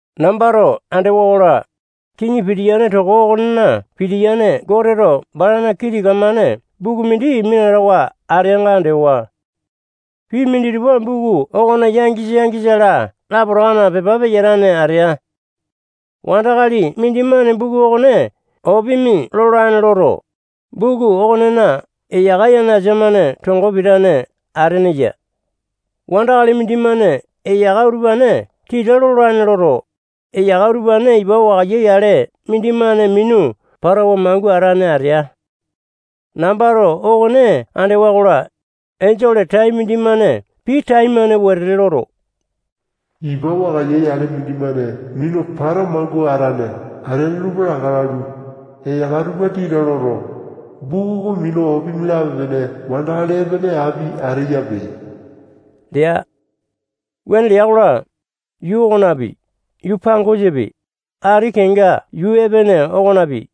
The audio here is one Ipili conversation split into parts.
Nambato andewa-kola, kiŋi pitiyane toko okonena pitiyane Goteto balana kii tika-mane buku mindi minatawa ateanga andewa. Pii minditupa buku okona yangisa-yangisa-la lapotakana pepa peyatane atea. Wandakali mindimane buku okone opimi lolane loto, buku okonena eyaka yanasa-mane tongo pitane atene ya. Wandakali mindimane eyaka utupane tita lolane loto, eyaka utupane ipa wakaiya yale mindimane minu patawa mangua atane atea. Nambato okone andewa-kola, enjole tai mindimane pii taimane wetete loto, ipa wakaiya yale mindimane minu patawa mangua atane ateane tupa laka lalu, eyaka tupa tita loto, buku oko minu opimi lape-pene wandakali epene api ateyape lea. Wuane lea-kola, yuu okonapi, yuu pangosapi, ati kenga yuu epene okonapi,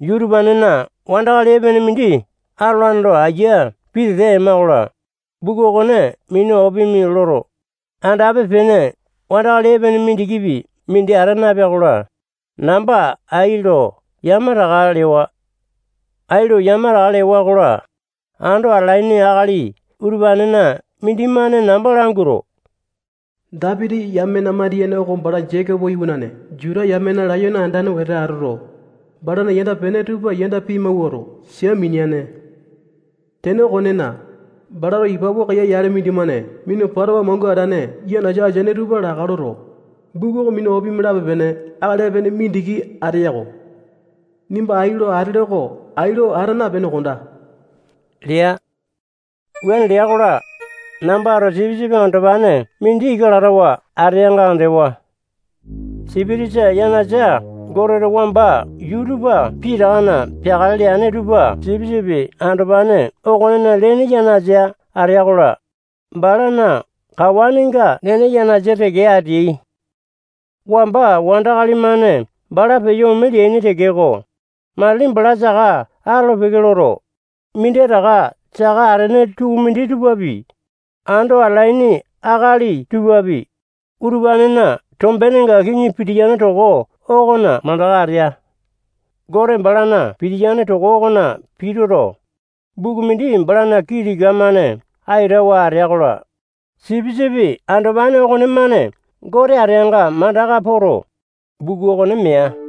yuu utupanena wandakali epene mindi atolane lo ayia pitete ema-kola, buku okone minu opimi loto, andape-pene wandakali epene mindikipi mindi ata napea-kola, namba ai lo yamataka lewa. Ai lo yamataka lewa-kola, ando atalaini akali utupanena mindimane namba languato, Dapiti yamena mandiyene oko bala Jekopo iwanane Juta yamena layone andane wete atoto, balana yanda-pene tupa yanda pimawuato, sia mineane. Tene okonena, balato ipa wakaiya yale mindimane minu patawa mangua atane yanasa ateaini tupa laka loto, buku oko minu opimi lape-pene akali epene mindiki ateya-ko. Nimba ai lo atele oko ai lo ata napene kondaa lea. Wuane lea-kola, nambato Sipisipi Andopane mindi ika latawa ateanga andewa. Sipitisa yanasa Goteto wamba yuu tupa pitakana peakale leane tupa Sipisipi Andopane okonena lene yanasa ateai-kola, balana kawanenga nene yanasa teke ateai. Wamba wandakali-mane bala peyo ome leaini tekeko, matili bala saka atolo-peke loto, minditaka saka atene tukumindi tupapi, ando atalaini akali tupapi, utupanena tombenenga kiŋi pitiyane toko okona mandaka atea. Gote balana pitiyane toko okona pituto, buku mindi balana kii tika-mane aitawa atea-kola, Sipisipi Andopane okonemane Gote ateanga mandaka poto, buku okone mea.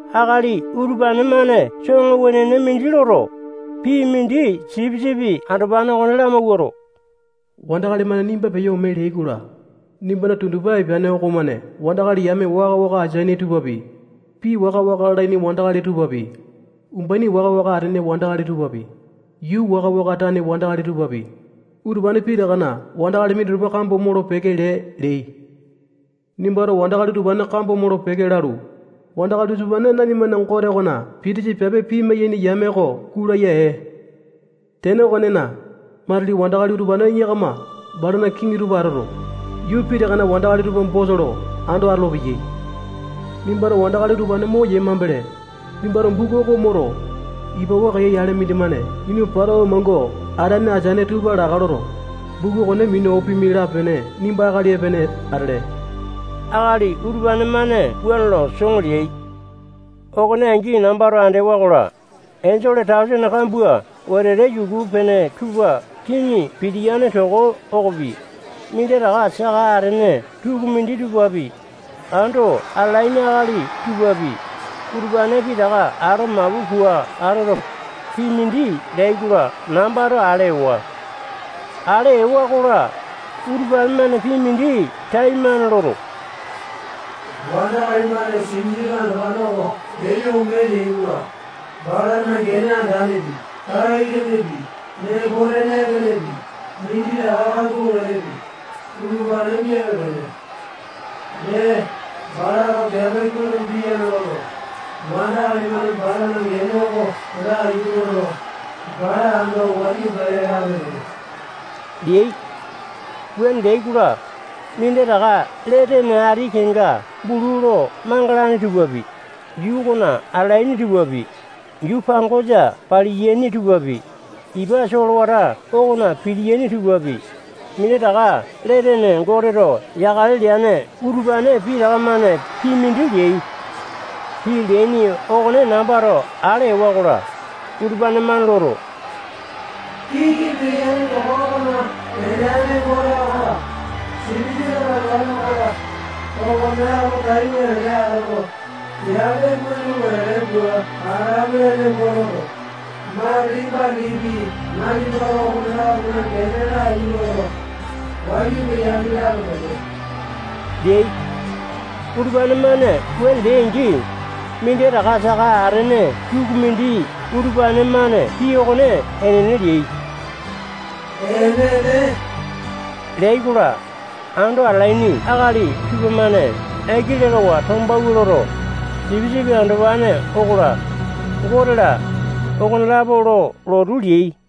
Akali utupane-mane soŋo wenene mindi loto, pii mindi Sipisipi Andopane okone lamawuato, wandakali-mane nimba peyo ome leai-kola, nimbana tundupa epeane okomane wandakali yame waka-waka ateaini tupapi, pii waka-waka lalaini wandakali tupapi, umbaini waka-waka atene wandakali tupapi, yuu waka-waka tane wandakali tupapi, utupane pitakana wandakali minditupa kambo molo-peke lee leai. Nimbato wandakali utupane kambo molo-peke lalu, wandakali utupane nanimana Gote okona pitisa piape pimai-yaini yame oko gulaya ee. Tene okonena, matili wandakali utupane yakama balana kiŋi tupa atoto, yuu pitakana wandakali tupa bosa lo ando atolopeyai. Nimbato wandakali utupane moyee mambele, nimbato buku oko moto, ipa wakaiya yale mindimane minu patawa mangua atane ateane tupa laka loto, buku okone minu opimi lape-pene nimba akali epene atele. Akali utupane-mane wuane lo soŋo leai. Okone angi nambato andewa-kola, enjole tausene kambua wetete yuku-pene tupa kiŋi pitiyane toko okopi, minditaka saka atene tukumindi tupapi, ando atalaini akali tupapi, utupane pitaka ato mapu pua atoto, pii mindi leai-kola, nambato ale ewa. Ale ewa-kola, utupane-mane pii mindi taimane loto, wandakali-mane Sipisipi Andopane oko peyo ome leai-kola, balana gene andanepi, tai-lenepi, nembo-tene epenepi, minditaka kambua wetepi, utupane miape-pene. Dee, balato piape kuai lo piyane loto, wandakali-mane balana gene oko laiyu loto, bala ando wayu pele lape-pene leai. Wuane leai-kola, minditaka lee tene ati kenga bulu lo mangalane tupapi, yuu okona atalaini tupapi, yuu pangosa paliyane tupapi, ipa solewata okona pitiyaini tupapi, minditaka lee tene Goteto yakale leane utupane pitaka-mane pii mindi leai. Pii leaini okone nambato ale ewa-kola, utupane-mane loto, kiŋi pitiyane toko okona peteane Gote okola, Sipisipi Andopane okola, okonelapo tai wetete atoto, piape kuai lo wetete pua atalapele nembo toto, matili-matilipi nanimato okone-lapona gene laiyu loto, wayu peyapi lape-pene leai. Utupane-mane wuane leai-angi, minditaka saka atene tukumindi utupane-mane pii okone enene leai. Enene leai-kola, ando atalaini akali tupamane aiki lekawa tombawua loto, Sipisipi Andopane okola, Gote-la, okonelapo lo lotu leai.